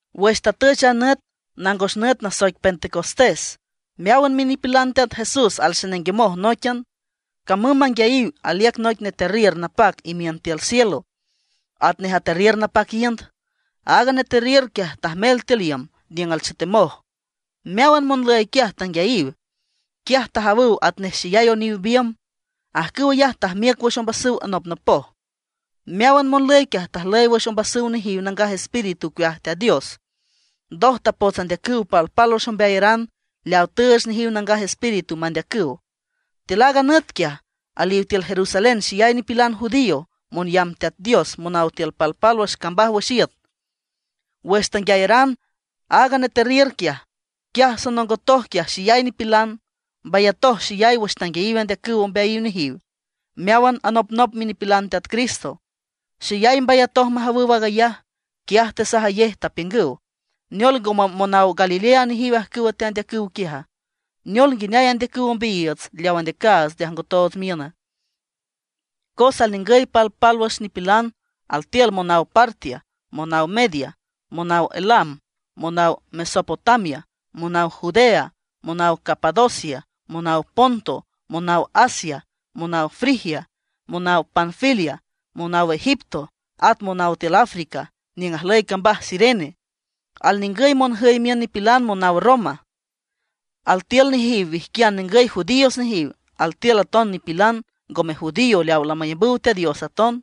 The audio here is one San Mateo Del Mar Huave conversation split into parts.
Wüx tatüch a nüt, nangos nüt nasoic Pentecostés, meáwan minipilan Teat Jesús alxenenguemoj nóiquian. Camüm manguiayiw aliüc noic neterriür napac imiün tiül cielo, atnej aterriür napac iünd. Aaga neterriür quiaj tajmel tiül iüm niüng alchetemoj. Meáwan monlüy quiaj tanguiayiw. Quiaj tajawüw atnej xeyay oniw biümb, ajcüw ayaj tajmiüc wüx ombasüw anopnopoj. Meáwan monlüy quiaj tajlüy wüx ombasüw nejiw Nangaj Espíritu ocueaj Teat Dios. Ndoj tapots andeacüw pálwüx ombeayaran leaw tüüch nejiw Nangaj Espíritu mandeacüw. Tiül aaga nüt quiaj, aliw tiül Jerusalén xeyay nipilan judío, monyamb Teat Dios monaw tiül palpálwüx cambaj wüx iüt. Wüx tanguiayaran aaga neterriür quiaj, quiaj sonongotoj quiaj xeyay nipilan. Mbayatoj xeyay wüx tanguiayiw andeacüw ombeayiw nejiw meáwan anopnop minipilan Teat Cristo. Xeyay mbayatoj majawüw aag ayaj, quiaj tesajayej, tapiüngüw: ―¿Neol, ngome monaw Galilea nejiw ajcüwa teandeacüw quiaja? ¿Neol, nguineay andeacüw ombeayiiütsa, leaw andeacaats nde ajngotoots miüna? Cos alningüy palpálwüx nipilan, altiül monaw Partia, monaw Media, monaw Elam, monaw Mesopotamia, monaw Judea, monaw Capadocia, monaw Ponto, monaw Asia, monaw Frigia, monaw Panfilia, monaw Egipto, at monaw tiül Africa niüng ajlüy cambaj Cirene. Alningüy monjüy miün nipilan naw Roma. Altiül nejiw wijquian ningüy judíos nejiw; altiül aton nipilan ngome judío leaw lamayambüw Teat Dios aton.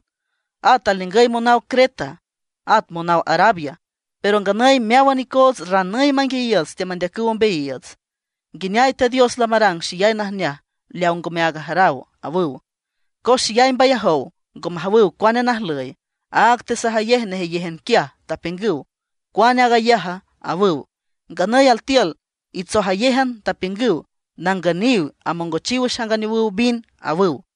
At alningüy monaw Creta, at monaw Arabia. Pero nganüy meáwan icoots ranüy manguiayiiüts teamandeacüw ombeayiiüts, nguineay Teat Dios lamarang xeyay najneaj leaw ngome áag ajaraw ―awüw. Cos xeyay mbayajow, ngo majawüw cuane najlüy, áag tesajayej nejeyéjan quiaj, apiüngüw: ―¿Cuane aag ayaja? ―awüw. Nganüy altiül itsojayéjan, tapiüngüw: ―Nangüniw, amongochiw wüx anganeowüw vin ―awüw.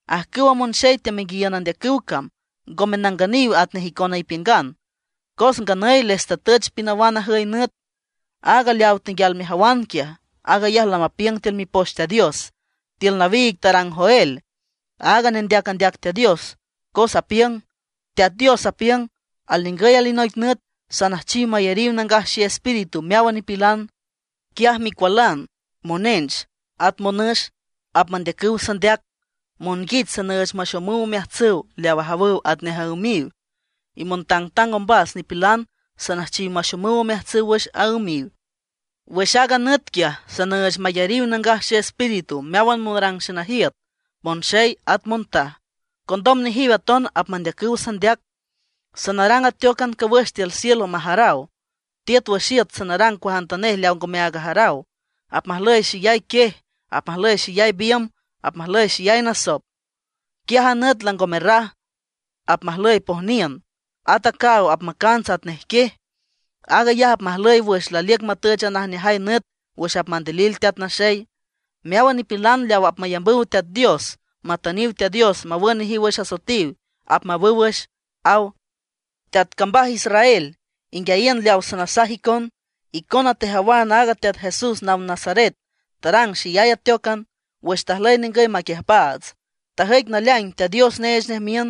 Ajcüwa monxey teamenguiayiün andeacüw cam ngome nangüniw atnej icona ipiüngan. Cos nganüy les tatüch pinawan ajüy nüt. Aaga leaw tenguial mejawan quiaj, aag ayaj lamapiüng tiül Mipoch Teat Dios, tiül nawiig tarang Joel, aaga nendeac andeac Teat Dios, cos apiüng: Teat Dios apiüng: Alningüy alinoic nüt, sanüjchiw mayariw Nangaj Xeespíritu meáwan nipilan; quiaj micualan monench at monüx apmandeacüw sandeac, monguich sanüüch maxomüw omeajtsüw leaw ajawüw atnej aümiw, y montangtang ombas nipilan sanüjchiw maxomüw omeajtsüw wüx aümiw. Wüx aaga nüt quiaj, sanüüch mayariw Nangaj Xeespíritu meáwan monrang xenajiüt, monxey at montaj; condom nejiw aton apmandeacüw sandeac. Sanarang ateócan cawüx tiül cielo majaraw, tiüt wüx iüt sanarang cuajantanej leaw ngomeaag ajaraw. Apmajlüy xeyay quiej, apmajlüy xeyay biümb, at apmajlüy xeyay nasop. Quiaj a nüt lango merraj, apmajlüy pojniün, at a caaw apmacants atnej quiej. Aag ayaj apmajlüy wüx laliüc matüch a najneajay nüt wüx apmandilil Teat Naxey. Meáwan nipilan leaw apmayambüw Teat Dios, matüniw Teat Dios mawün nejiw wüx asoetiw, apmawüw wüx, aw. ’Teat cambaj Israel, inguiayiün leaw sanasaj icon: Icona tejawan aaga Teat Jesús naw Nazaret tarang xeyay ateócan wüx tajlüy ningüy maquiüjpaats. Tajüic naleaing Teat Dios neech nej miün,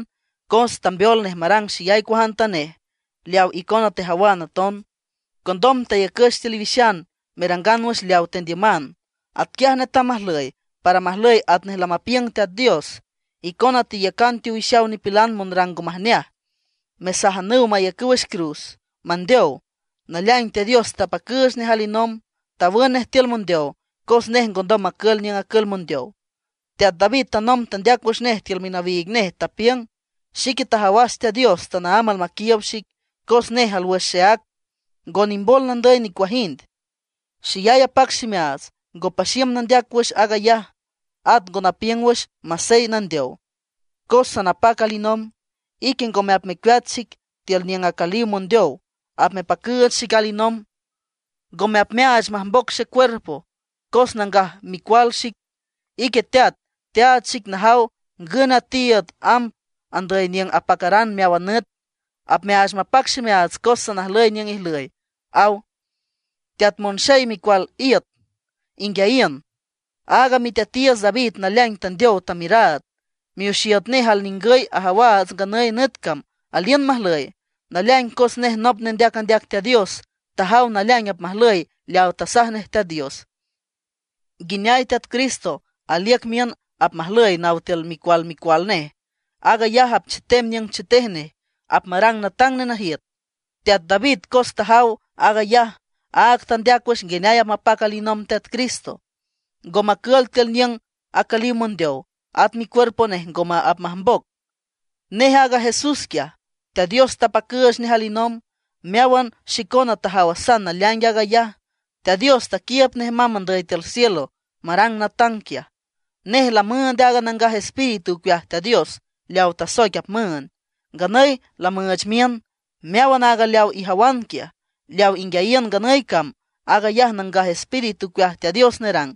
cos tambeol nej marang xeyay cuajantanej, leaw icona tejawan aton. Condom tayacüch tiül iwixan merangan wüx leaw tendiüman. Atquiaj netam majlüy, para majlüy atnej lamapiüng Teat Dios. Icona teyacan teowixaw nipilan monrang ngo majneaj, tesajanüw mayacüw wüx cruz mandeow. Naleaing Teat Dios tapacüüch nej alinomb, tawün nej tiül mondeow, cos nej ngondom macül niüng acül mondeow. Teat David tanomb tandeac wüx nej tiül minawiig nej, tapiüng: Xique tajawas Teat Dios tanaámb almaquiiüb xic; cos nej alwüx xeác, ngo nimbol nandüy nicuajind. Xeyay apac ximeaats, ngo paxiüm nandeac wüx aag ayaj. At ngo napiüng wüx masey nandeow, cos sanapac alinomb. Ique ngome apmecueat xic tiül niüng acüliw mondeow, apmepacüüch xic alinomb. Ngome apmeaach majmboc xecuerpo, cos nangaj micual xic. Ique Teat, teaach xic najaw ngün a tiiüd amb andüy niüng apacaran meáwan nüt. Apmeaach mapac ximeaats cos sanajlüy niüng ijlüy, aw. ’Teat monxey micual iüt, inguiayiün. Aaga miteatiiüts David naleaing tandeow tamiüraad; mioxiüt nej alningüy ajawaats nganüy nüt cam aliün majlüy. Naleaing cos nej nop nej nendeac andeac Teat Dios tajaw naleaing apmajlüy leaw tasaj nej Teat Dios, nguineay Teat Cristo aliüc miün apmajlüy naw tiül micual micual nej. Aag ayaj apchetem niüng chetej nej, apmarang natang nenajiüt. Teat David, cos tajaw aag ayaj, áag tandeac wüx nguineay apmapac alinomb Teat Cristo, ngo macül tiül niüng acüliw mondeow, at micuerpo nej ngome apmajmboc. Nej aaga Jesús quiaj, Teat Dios tapacüüch nej alinomb. Meáwan xicona tajawasan naleaing aag ayaj. Teat Dios taquiiüb nej mamb andüy tiül cielo marang natang quiaj. Nej lamüünd aaga Nangaj Espíritu ocueaj Teat Dios leawa tasoic apmüünd. Nganüy lamüüch miün. Meáwan aaga leaw ijawan quiaj, leaw inguiayiün nganüy cam, aag ayaj Nangaj Espíritu ocueaj Teat Dios nerang.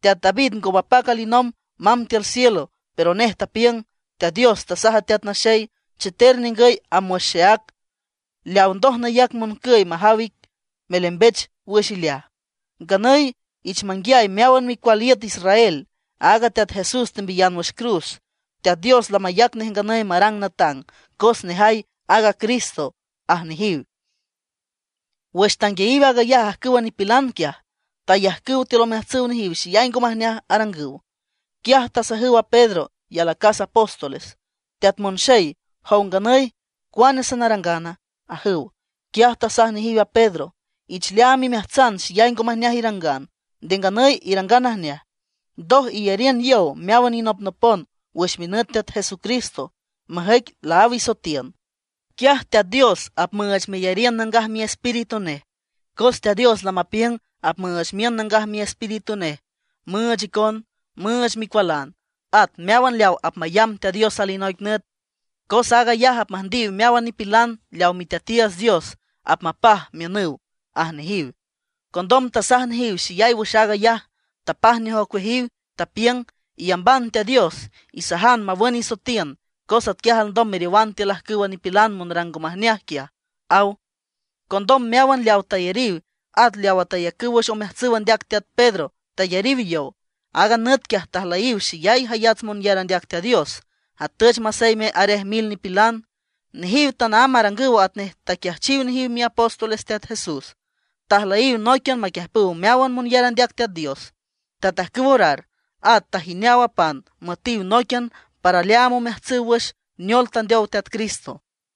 Teat David ngo mapac alinomb mamb tiül cielo, pero nej tapiüng: Teat Dios tasaj a Teat Naxey: “Cheter ningüy amb wüx xeác, leaw ndoj nayac moncüy majaw ic, melembech wüx ileaj”. ’Nganüy ich manguiay meáwan micual iüt Israel, aaga Teat Jesús tembiyan wüx cruz, Teat Dios lamayac nej nganüy marang natang, cos nejay aaga Cristo ―aj nejiw. Wüx tanguiayiw aag ayaj ajcüwa nipilan quiaj, tayajcüw tiül omeajtsüw nejiw xeyay ngo majneaj arangüw. Quiaj tasajüw a Pedro y alacas apóstoles: ―Teat monxey, jow nganüy ¿cuane sanarangana? ―ajüw. Quiaj tasaj nejiw a Pedro: ―Ich leaam imeajtsan xeyay ngo majneaj irangan, nde nganüy irangan najneaj. Ndoj iyariün yow meáwan inopnopon wüx minüt Teat Jesucristo, majüic laáw isoetiün. Quiaj Teat Dios apmüüch meyariün Nangaj Miespíritu nej. Cos Teat Dios lamapiüng apmüüch miün Nangaj Miespíritu nej müüch icon, müüch micualan, at meáwan leaw apmayamb Teat Dios alinoic nüt. Cos aag ayaj apmüjndiw meáwan nipilan leaw Miteatiiüts Dios apmapaj miünüw ―aj nejiw. Condom tasaj nejiw xeyay wüx aag ayaj, tapaj nej ocueajiw, tapiüng: ―Iyamban Teat Dios, isajan mawün isoetiün, cos atquiaj alndom meriowan tiül ajcüwa nipilan monrang ngo majneaj quiaj ―aw. Condom meáwan leawa tayariw, at leawa tayacüw wüx omeajtsüw andeac teat Pedro tayariw yow. Aaga nüt quiaj tajlüyiw xeyay jayats monyar andeac Teat Dios, atüch maseyme arej mil nipilan. Nejiw tanaámb arangüw atnej taquiajchiw nejiw miapóstoles Teat Jesús. Tajlüyiw nóiquian maquiüjpüw meáwan monyar andeac Teat Dios, tatajcüw orar, at tajineaw a pan müetiw nóiquian para leaam omeajtsüw wüx neol tandeow Teat Cristo.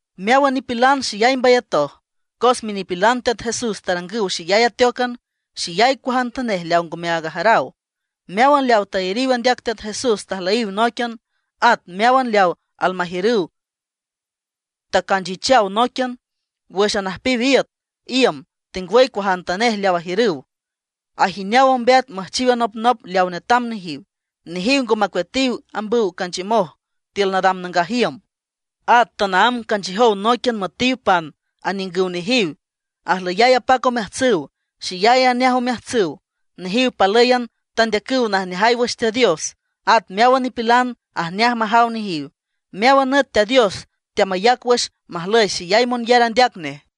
Meáwan nipilan xeyay mbayatoj, cos minipilan Teat Jesús tarangüw xeyay ateócan, xeyay cuajantanej leaw ngome aag ajaraw. Meáwan leaw tayariw andeac Teat Jesús tajlüyiw nóiquian. At meáwan leaw almajiürüw tacanchichaw nóiquian. Wüx anüjpiw iüt, iüm, tengwüy cuajantanej leaw ajiürüw, ajineaw ombeat müjchiw anopnop leaw netam nejiw. Nejiw ngo macueatiw ambüw canchiümoj tiül nadam nangaj iüm. At tanaámb canchiüjow nóiquian müetiw pan aniüngüw nejiw. Ajlüyay apac omeajtsüw, xeyay ajneaj omeajtsüw. Nejiw palǘyan tandeacüw najneaj wüx Teat Dios, at meáwan nipilan ajneaj majaw nejiw. Meáwan nüt Teat Dios teamayac wüx majlüy xeyay monyar andeac nej.